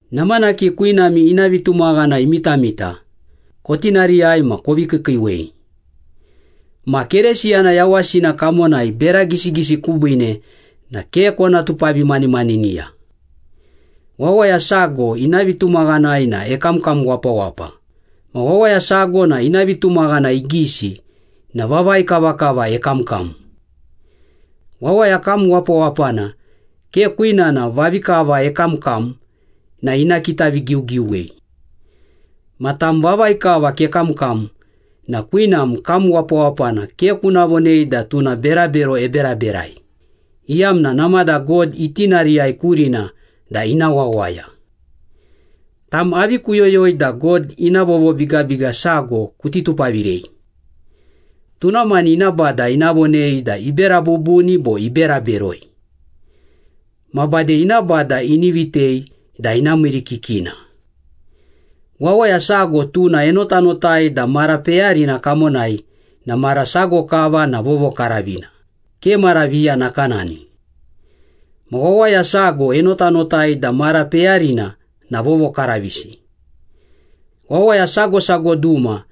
Namanaki kwinami ina vitumaghana imitamita, kotinariyai ma kovi kiikiiwei. Ma Keresiyana yawasina kamonai bera gisigisi kubiine na ke kona tupavimanimaniniya. Wawaya sago ina vitumaghanai na ekamkam wapawapa, ma wawaya sago na ina vitumaghana igisi na vavai kavakava ekamkam. Wawaya kam wapawapana ke kwinana vavi kava ekamkam na ina kitavigiugiuwei. Ma tam vavi kava kekamkam na kwinam kam wapawapana ke kuna vonei da tuna berabero eberaberai, iyamna namada God itinariyai kurina da ina wawaya. Tam avi kuyoyoi da God ina vovobigabiga sago kuti tupavirei? Tuna mani ina Bada ina vonei da ibera bubuni bo ibera beroi. Ma bade ina Bada ini vitei da ina miirikikina. Wawaya sago tuna enotanotai da mara peyarina kamonai na mara sago kava na vovokaravina, ke mara viya nakanani. Ma wawaya sago enotanotai da mara peyarina na vovokaravisi. Wawaya sago sago duma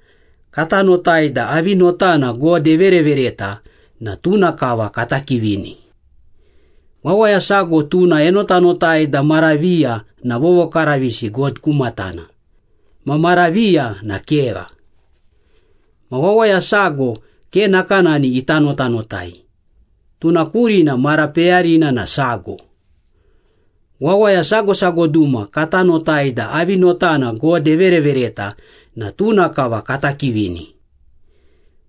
kata notai da avi notana God everevereta na tuna kava kata kivini. Wawaya sago tuna enotanotai da mara viya na vovokaravisi God ku matana, ma mara viya na kegha. Ma wawaya sago ke nakanani ita notanotai, tuna kurina mara peyarina na sago. Wawaya sago sago duma kata notai da avi notana God everevereta na tuna kava kata kivini.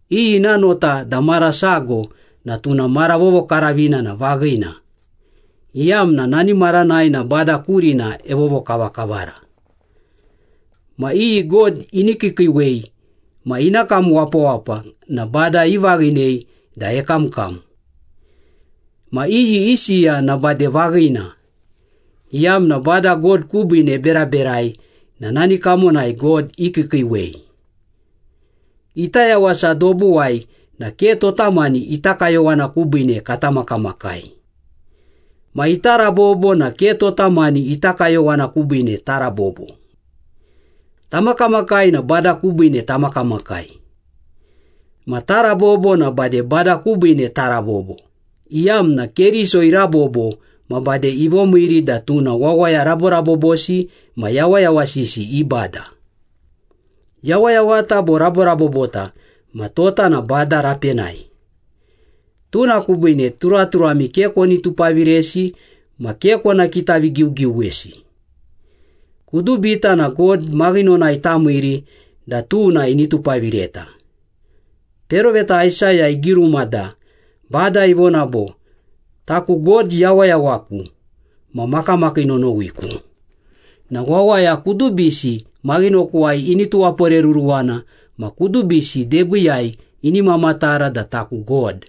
Iyi ina nota da mara sago na tuna mara vovokaravina na vaghina, iyamna nani maranai na Bada kurina evovokavakavara. Ma iyi God ini kiikiiwei ma ina kam wapawapa na Bada ivaghinei da ekamkam. Ma iyi isiya na bade vaghina, iyamna Bada God kubiine eberaberai na nani kamonai God ikiikiiwei. Ita yawasa dobuwai na ke tota mani ita kayowana kubiine kata makamakai. Ma ita rabobo na ke tota mani ita kayowana kubiine tarabobo. Tamakamakai na Bada kubiine tamakamakai. Ma tarabobo na bade Bada kubiine tarabobo, iyamna Keriso irabobo ma bade ivomiiri da tuna wawaya raborabobosi ma yawayawasisi i Bada. Yawayawata bo raborabobota ma tota na Bada rapenai. Tuna kubiine turaturami ke koni tupaviresi ma ke kona kitavigiugiuwesi. Kudubita na God maghinonai tamiiri da tuna ini tupavireta. Peroveta Aisaya igiruma da, Bada ivona bo, “Taku God yawayawaku ma makamakii nonowiku, na wawaya kudubisi maghinokuwai ini tuwaporeruruwana ma kudubisi debiiyai ini mamatara da taku God.”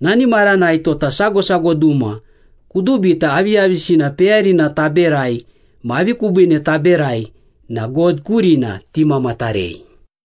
Nani maranai tota sago sago duma kudubita aviyavisina peyarina taberai ma avi kubiine taberai na God kurina timamatarei.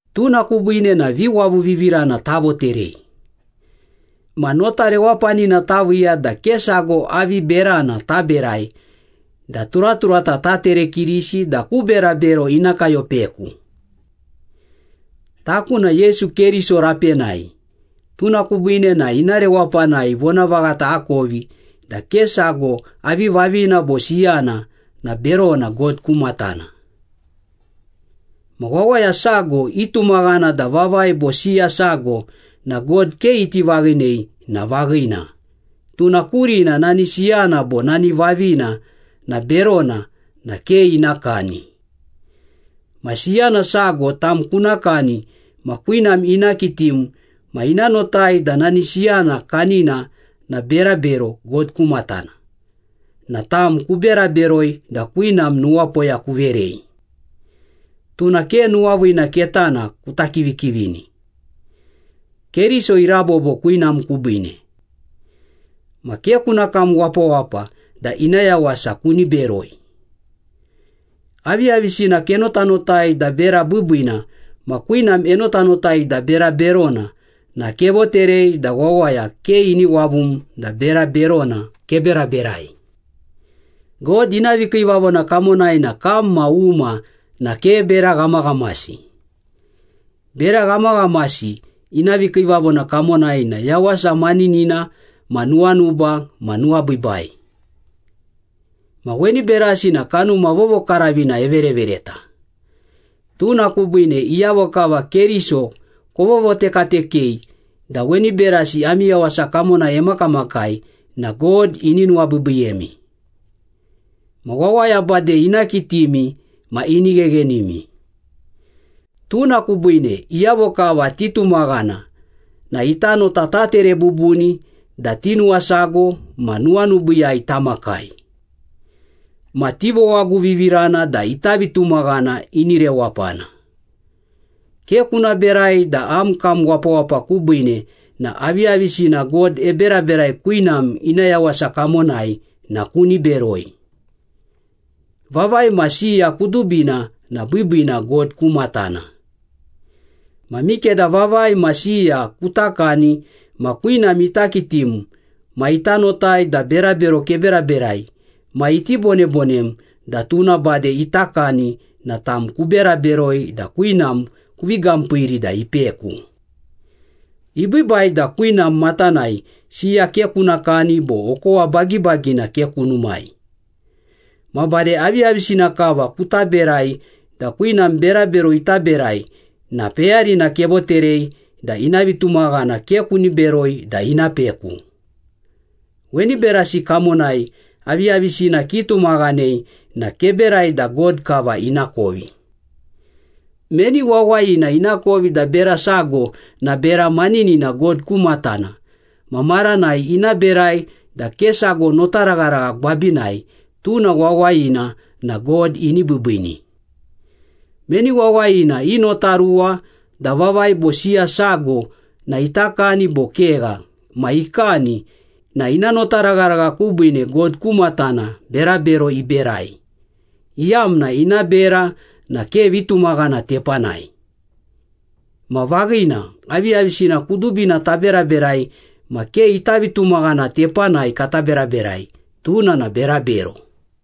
Tuna kubiine na viwavuvivirana tavoterei. Ma notarewapanina taviiya da ke sago avi berana taberai da turaturata taterekirisi da ku berabero ina kayopeku. Taku na Yesu Keriso rapenai, tuna kubiine na ina rewapanai vonavaghata akovi da ke sago avi vavina bo siyana na berona God ku matana. Ma wawaya sago itumaghana da vavai bo siya sago na God ke iti vaghinei na vaghina, tuna kurina nani siyana bo nani vavina na berona na ke ina kani. Ma siyana sago tam kuna kani ma kwinam ina kitim ma ina notai da nani siyana kanina na berabero God ku matana, na tam kubera beroi da kwinam nuwapoya kuverei. Tuna ke nuwaviina ketana kuta kivikivini. Keriso irabobo kwinam kubiine. Ma ke kuna kam wapawapa da ina yawasa kuni beroi. Aviyavisina kenotanotai da bera biibiina ma kwinam enotanotai da bera berona na kevoterei da wawaya ke ini wavum da bera berona keberaberai. God ina vikiivavona kamonai na kam ma uma na ke bera ghamaghamasi. Bera ghamaghamasi ina vikiivavona kamonai na yawasa maninina ma nuwanuba ma nuwabiibai. Ma weni berasi na Kanuma Vovokaravina everevereta. Tuna kubiine iyavo kava Keriso kovovotekatekei da weni berasi ami yawasa kamonai emakamakai na God ini nuwabiibiiyemi. Ma wawaya bade ina kitimi ma ini gheghenimi. Tuna kubiine, iyavo kava titumaghana na ita nota tatere bubuni da tinuwasago ma nuwanubiiyai tamakai. Ma tivowaguvivirana da ita vitumaghana ini rewapana. Ke kuna berai da am kam wapawapa kubiine na aviyavisina God eberaberai kwinam ina yawasa kamonai na kuni beroi. Vavai ma siya kudubina na biibiina God ku matana. Ma mikeda vavai ma siya kuta kani ma kwinam ita kitim ma ita notai da berabero keberaberai ma iti bonebonem da tuna bade ita kani na tam, kubera beroi da kwinam kuvi gampiiri da ipeku. Ibiibai da kwinam matanai siya ke kuna kani bo okowa bagibagina ke kunumai. Ma bade aviyavisina kava kuta berai da kwinam berabero ita berai na peyarina kevoterei da ina vitumaghana ke kuni beroi da ina peku. Weni berasi kamonai aviyavisina kitumaghanei na keberai da God kava inakovi. Meni wawayina inakovi da bera sago na bera maninina God ku matana ma maranai ina berai da ke sago notaragharagha gwabinai, tuna wawayina na God ini biibiini. Meni wawayina inotaruwa da vavai bo siya sago na ita kani bo kegha ma ikani na ina notaragharagha kubiine God ku matana berabero iberai, iyamna ina bera na ke vitumaghana tepanai. Ma vaghina, aviyavisina kudubina taberaberai ma ke ita vitumaghana tepanai kata beraberai, tuna na berabero.